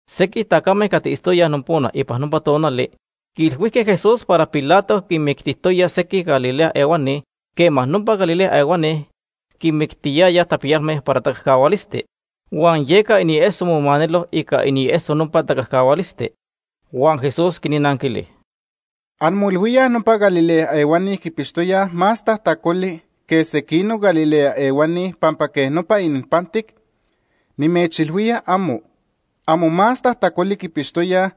Sequij tacame cati itztoyaj nopona ipan nopa tonali quiilhuijque Jesús para Pilato quinmictijtoya sequij Galilea ehuani quema nopa Galilea ehuani quinmictiyayaj tapiyalme para tacajcahualisti. Huan yeca inieso momanelo ica inieso nopa tacajcahualisti. Huan Jesús quinnanquili: “¿Anmoilhuíaj nopa Galilea ehuani quipixtoyaj más tajtacoli que sequinoc Galilea ehuani pampa quej nopa ininpantic? Nimechilhuía, amo. Amo más tajtacoli quipixtoyaj,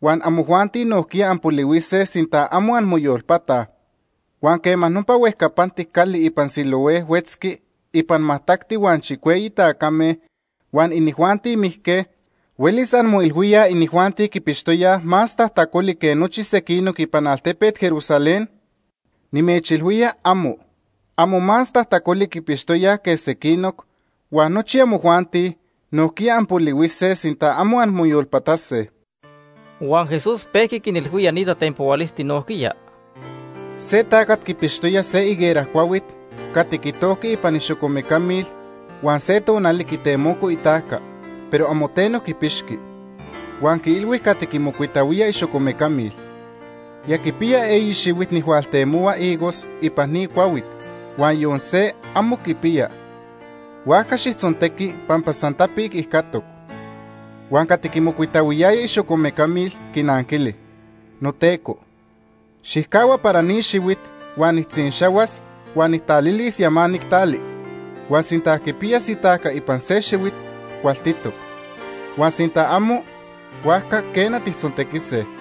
huan amojuanti nojquiya anpolihuise sinta amo anmoyolpataj. Huan quema nopa huejcapantic cali ipan Siloé huetzqui ipan majtacti huan chicueyi tacame huan inijuanti mijque, huelis anmoilhuíaj inijuanti quipixtoyaj más tajtacoli que nochi sequinoc ipan altepet Jerusalén. Nimechilhuía, amo. Amo más tajtacoli quipixtoyaj que sequinoc, huan nochi amojuanti nojquiya anpolihuise, sinta amo anmoyolpatase.” Huan Jesús pejqui quinilhuía ni tatenpohualisti nojquiya: “Se tacat quipixtoya se higuera cuahuit cati quitojqui ipan ixocomeca mil huan se tonali quitemoco itajca, pero amo teno quipixqui. Huan quiilhui cati quimocuitahuía ixocomecamil: ‘Ya quipiya eyi xihuit nijhualtemohua higos ipan ni cuahuit, huan yon se amo quipiya, huajca xijtzontequi pampa san tapic ijcatoc.’ Huan cati quimocuitahuiyaya ixocomecamil quinanquili: ‘Noteco, xijcahua para ni xihuit huan nijtzinxahuas huan nijtalilis yamanic tali, huan sinta quipiyas itajca ipan se xihuit, cualtitoc, huan sinta amo, huajca quena, tijtzontequise.’”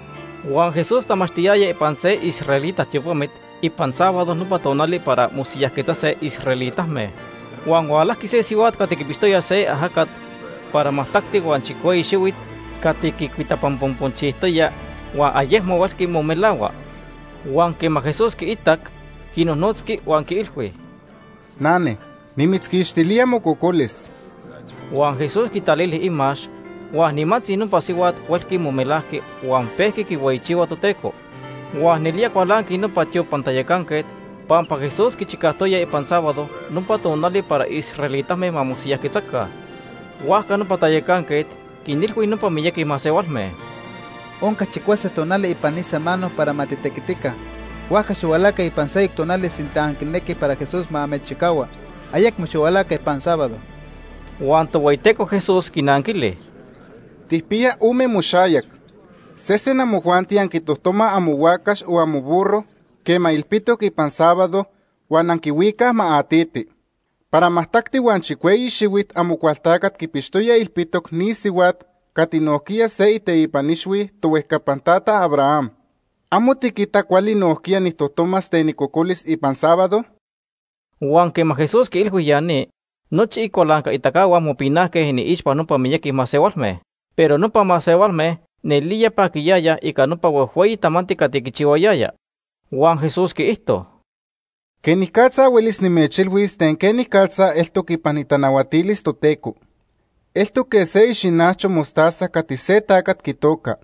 Huan Jesús tamachtiyaya ipan se israelita tiopamit ipan sábado nopa tonali para mosiyajquetzase israelitame, huan hualajqui se sihuat cati quipixtoya se ajacat para majtacti huan chicueyi xihuit cati quicuitapanponponchijtoya huan ayecmo huelqui momelahua. Huan quema Jesús quiitac, quinojnotzqui huan quiilhui: ―Nane, nimitzquixtilía mococolis. Huan Jesús quitalili imax huan nimantzi nopa sihuat huelqui momelajqui huan pejqui quihueyichihua Toteco. Huan nelía cualanqui nopa tiopan tayacanquet pampa Jesús quichicajtoya ipan sábado, nopa tonali para israelitame ma mosiyajquetzaca. Huajca nopa tayacanquet quinilhui nopa miyaqui masehualme: ―Onca chicuase tonali ipan se samano para ma titequitica, huajca xihualaca ipan seyoc tonali sinta anquinequij para Jesús ma amechchicahua. Ayecmo xihualaca ipan sábado. Huan Tohueyiteco Jesús quinanquili: ―Tijpiya ome moxayac. Sesen amojuanti anquitojtomaj amohuacax o amoburro quema ilpitoc ipan sábado, huan anquihuicaj ma atiti. Para majtacti huan chicueyi xihuit Amocualtacat quipixtoya ilpitoc ni sihuat cati nojquiya se iteipan ixhui tohuejcapan tata Abraham. ¿Amo tiquita cuali nojquiya nijtojtomas ten icocolis ipan sábado? Huan quema Jesús quiilhui ya ni, nochi icualancaitacahua mopinajque iniixpa nopa miyaqui masehualme, pero nopa masehualme nelía paquiyayaj ica nopa huejhueyi tamanti cati quichihuayaya. Huan Jesús quiijto: “¿Quenicatza huelis nimechilhuis ten quenicatza eltoc ipan itanahuatilis Toteco? Eltoc quej se ixinacho mostaza cati se tacat quitoca.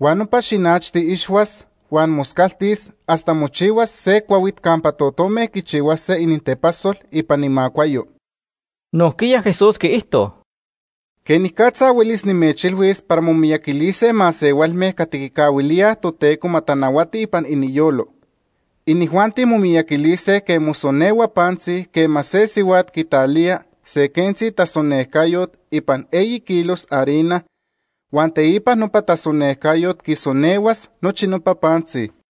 Huan nopa xinachti ixhuas huan moscaltis hasta mochihuas se cuahuit campa totome quichihuase inintepasol ipan imacuayo.” Nojquiya Jesús quiijto: “¿Quenicatza huelis nimechilhuis para momiyaquilise masehualme cati quicahuilíaj Toteco ma tanahuati ipan iniyolo? Inijuanti momiyaquilise quej mosonehua pantzi quema se sihuat quitalía se quentzi tasonejcayot ipan eyi kilos harina, huan teipa nopa tasonejcayot quisonehuas nochi nopa pantzi.”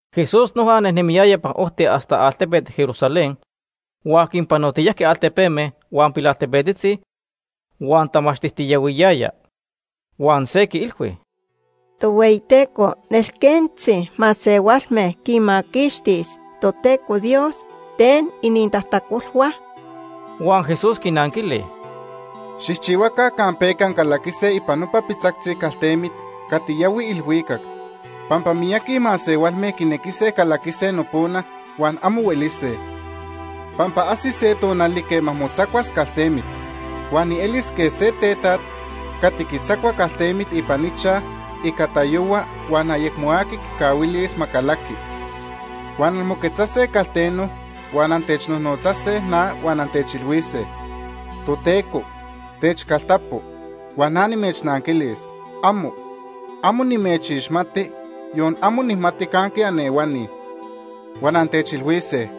Jesús noja nejnemiyaya ipan ojti hasta altepet Jerusalén huan quinpanotiyajqui altepeme huan pilaltepetzi huan tamachtijtiyahuiyaya. Huan se quiilhui: ―Tohueyiteco, ¿nelquentzi masehualme quinmaquixtis Toteco Dios ten inintajtacolhua? Huan Jesús quinanquili: ―Xijchihuaca campeca ancalaquise ipan nopa pitzactzi caltemit cati yahui ilhuicac, pampa miyaqui masehualme quinequise calaquise nopona huan amo huelise. Pampa ajsis se tonali quema motzacuas caltemit. Huan nielis quej se tetaj cati quitzacua caltemit ipan ichaj ica tayohua huan ayecmo aqui quicahuilis ma calaqui. Huan anmoquetzase calteno, huan antechnotzase na huan antechilhuise: ‘Toteco, techcaltapo’, huan na nimechnanquilis: ‘¡Amo! Amo nimechixmati, yon amo nijmati canque anehuani.’ Huan antechilhuise: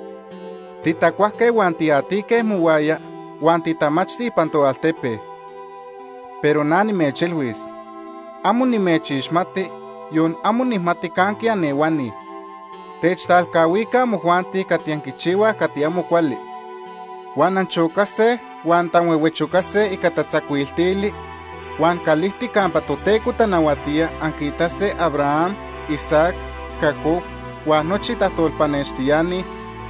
‘Titacuajque huan tiatique mohuaya, huan titamachti ipan toaltepe’, pero na nimechilhuis: ‘Amo nimechixmati, yon amo nijmati canque anehuani. Techtalcahuica amojuanti cati anquichihuaj cati amo cuali.’ Huan anchocase huan antanhuehuechocase ica tatzacuiltili huan calijtic campa Toteco tanahuatía anquiitase Abraham, Isaac, Jacob huan nochi tajtolpanextiani,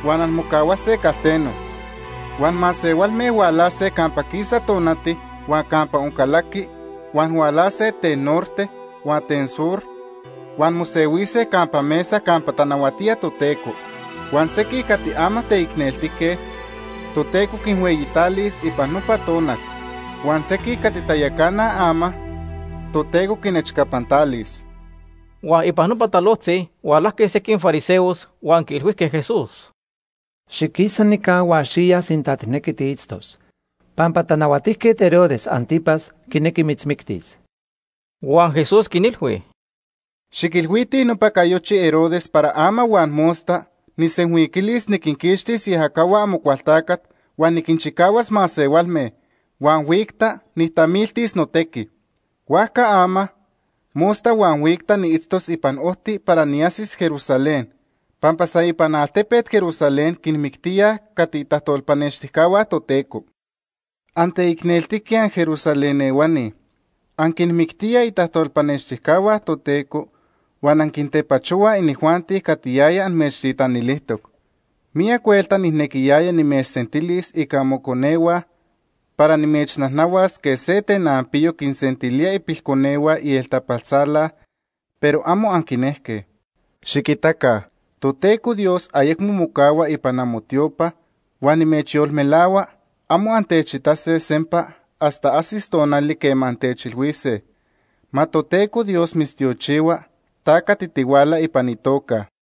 huan anmocahuase calteno. Huan masehualme hualase campa quisa tonati huan campa oncalaqui, huan hualase ten norte huan ten sur huan mosehuise campa mesa campa tanahuatía Toteco. Huan sequij cati ama teicneltique, Toteco quinhueyitalis ipan nopa tonal, huan sequij cati tayacanaj ama, Toteco quinechcapantalis. Huan ipan nopa talojtzi hualajque sequij fariseos huan quiilhuijque Jesús: ―Xiquisa nica huan xiya sinta tijnequi tiitztos, pampa Tanahuatijquet Herodes Ántipas quinequi mitzmictis. Huan Jesús quinilhui: ―Xiquilhuitij nopa cayochi Herodes para ama huan mosta nijsenhuiquilis niquinquixtis iajacahua Amocualtacat huan niquinchicahuas masehualme, huan huicta nijtamiltis notequi. Huajca ama, mosta huan huicta niitztos ipan ojti para niajsis Jerusalén, pampa san ipan altepet Jerusalén quinmictíaj cati itajtolpanextijcahua Toteco. “¡Anteicneltique anJerusalén ehuani! Anquinmictíaj itajtolpanextijcahua Toteco, huan anquintepachohuaj inijuanti cati yaya amechtitanilijtoc. Miyac huelta nijnequiyaya nimechsentilis ica amoconehua para nimechnajnahuas quej se tenanpiyo quinsentilía ipilconehua ieltapaltzala, pero amo anquinejque. Xiquita, Toteco Dios ayecmo mocahua ipan amotiopa, huan nimechyolmelahua amo antechitase sempa hasta ajsis tonali quema antechilhuise: ‘Ma Toteco Dios mitztiochihua ta cati tihuala ipan itoca Ica itequiticayo..’”